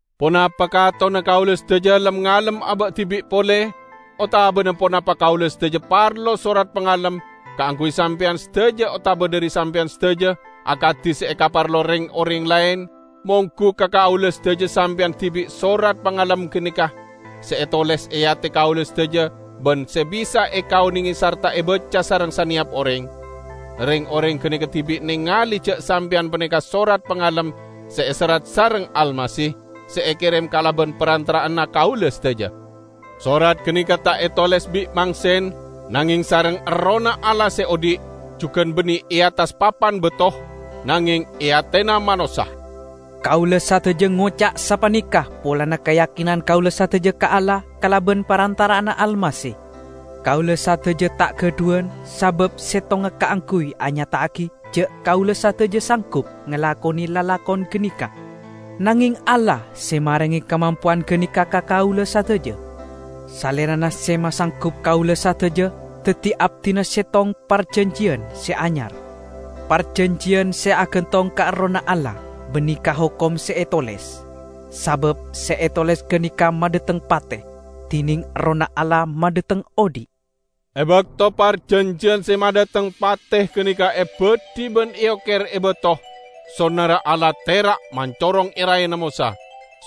Ponapa katonna kaula sadaja lem-ngalem aba' dibi' pole? Otabana ponapa kaula sadaja parlo sorat pangalem kaangguy sampeyan sadaja otaba dhari sampeyan sadaja, akadi se ekaparlo reng-oreng laen? Monggu ka kaula sadaja sampeyan dibi' sorat pangalem ganeka, se etoles e ate kaula sadaja ban se bisa ekaonenge sarta ebaca sareng saneyap oreng. Reng-oreng ganeka dibi' nengale ja' sampeyan paneka sorat pangalem se eserrat sareng Almasih, se ekerem kalaban parantara'anna kaula sadaja. Sorat ganeka ta' etoles bi' mangsen, nangeng sareng Errohna Allah se odhi'; jugan banne e attas papan bato, nangeng e atena manossa. Kaula sadaja ngoca' sapaneka polana kayakinan kaula sadaja ka Allah kalaban parantara'anna Almasih. Kaula sadaja ta' gadhuwan sabab settonga kaangguy anyata'agi ja' kaula sadaja sanggup ngalakone lalakon ganeka, nangeng Allah se marenge kamampowan ganeka ka kaula sadaja. Salerana se masanggup kaula sadaja daddi abdina settong parjanjiyan se anyar; parjanjiyan se agantong ka Errohna Allah, banne ka hokom se etoles. Sabab se etoles ganeka madhateng pate, dineng Errohna Allah madhateng odhi'. E bakto parjanjiyan se madhateng pate ganeka ebadhi ban eoker e bato, sonarra Allah tera' mancorong e raena Mosa.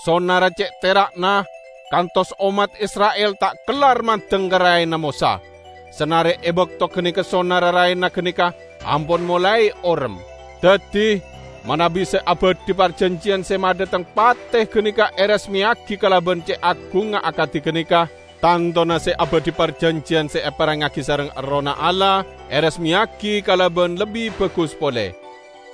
Sonarra ce' tera'na kantos ommat Isra'il ta' kellar mandeng ka raena Mosa, sanare e bakto ganeka sonarra raena ganeka ampon molae orem. Daddi, manabi se abadhi parjanjiyan se madhateng pate ganeka eresmeyagi kalaban ce' agungnga akadi ganeka, tantona se abadhi parjanjiyan se eparengngagi sareng Errohna Allah, eresmeyagi kalaban lebbi bagus pole.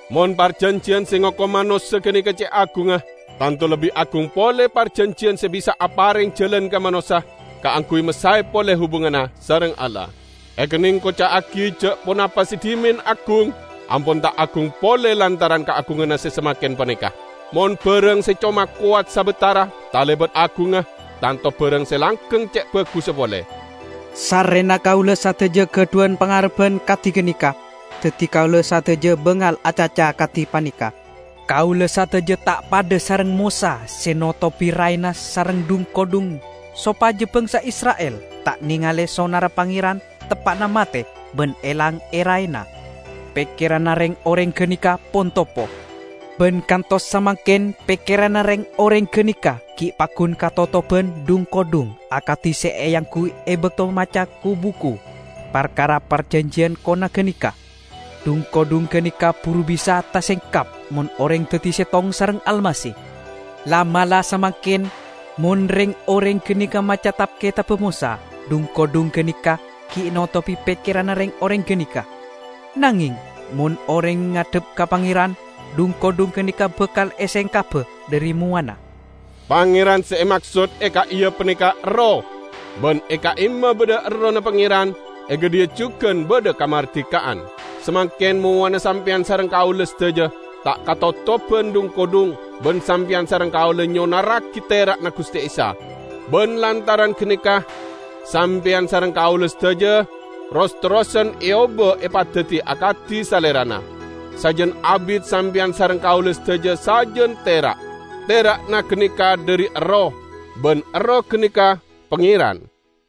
Mon parjanjiyan se ngokom manossa ganeka ce' agungnga, tanto lebbi agung pole parjanjiyan se bisa apareng jalan ka manossa kaangguy masae pole hubunganna sareng Allah. Ekenneng koca'agi ja' ponapa se dhimen agung, ampon ta' agung pole lantaran kaagunganna se samangken paneka. Mon barang se coma kowat sabatara talebat agungnga, tanto barang se langgeng ce' bagussa pole. Sarrena kaula sadaja gadhuwan pangarebban kadi ganeka, daddi kaula sadaja bangal acaca kadi paneka. Kaula sadaja ta' padha sareng Mosa se notobi raena sareng dhung-kodhung sopaja bangsa Isra'il ta' nengale sonarra Pangeran teppa'na mate ban elang e raena. Pekkeranna reng-oreng ganeka pon topo. Ban kantos samangken pekkeranna reng-oreng ganeka gi' paggun katotoban dhung-kodhung akadi se eangguy e bakto maca ku-buku parkara parjanjiyan kona ganeka. Dhung-kodhung ganeka buru bisa tasengkap mon oreng daddi settong sareng Almasih. La'-mala' samangken, mon reng-oreng ganeka maca tab-ketabba Mosa, dhung-kodhung ganeka gi' notobi pekkeranna reng-oreng ganeka. Nangeng mon oreng ngadhep ka Pangeran, dhung-kodhung ganeka bakal esengkaba dhari mowana. Pangeran se emaksod e ka'iya paneka Erroh. Ban e ka'imma badha Errohna Pangeran, e gadhiya jugan badha kamardika'an. Samangken mowana sampeyan sareng kaula sadaja ta' katotoban dhung-kodhung, ban sampeyan sareng kaula nyonarragi tera'na Guste Isa. Ban lantaran ganeka sampeyan sareng kaula sadaja ros-terrosan eoba epadaddi akadi Salerana; sajan abit sampeyan sareng kaula sadaja sajan tera'. Tera'na ganeka dhari Erroh, ban Erroh ganeka Pangeran.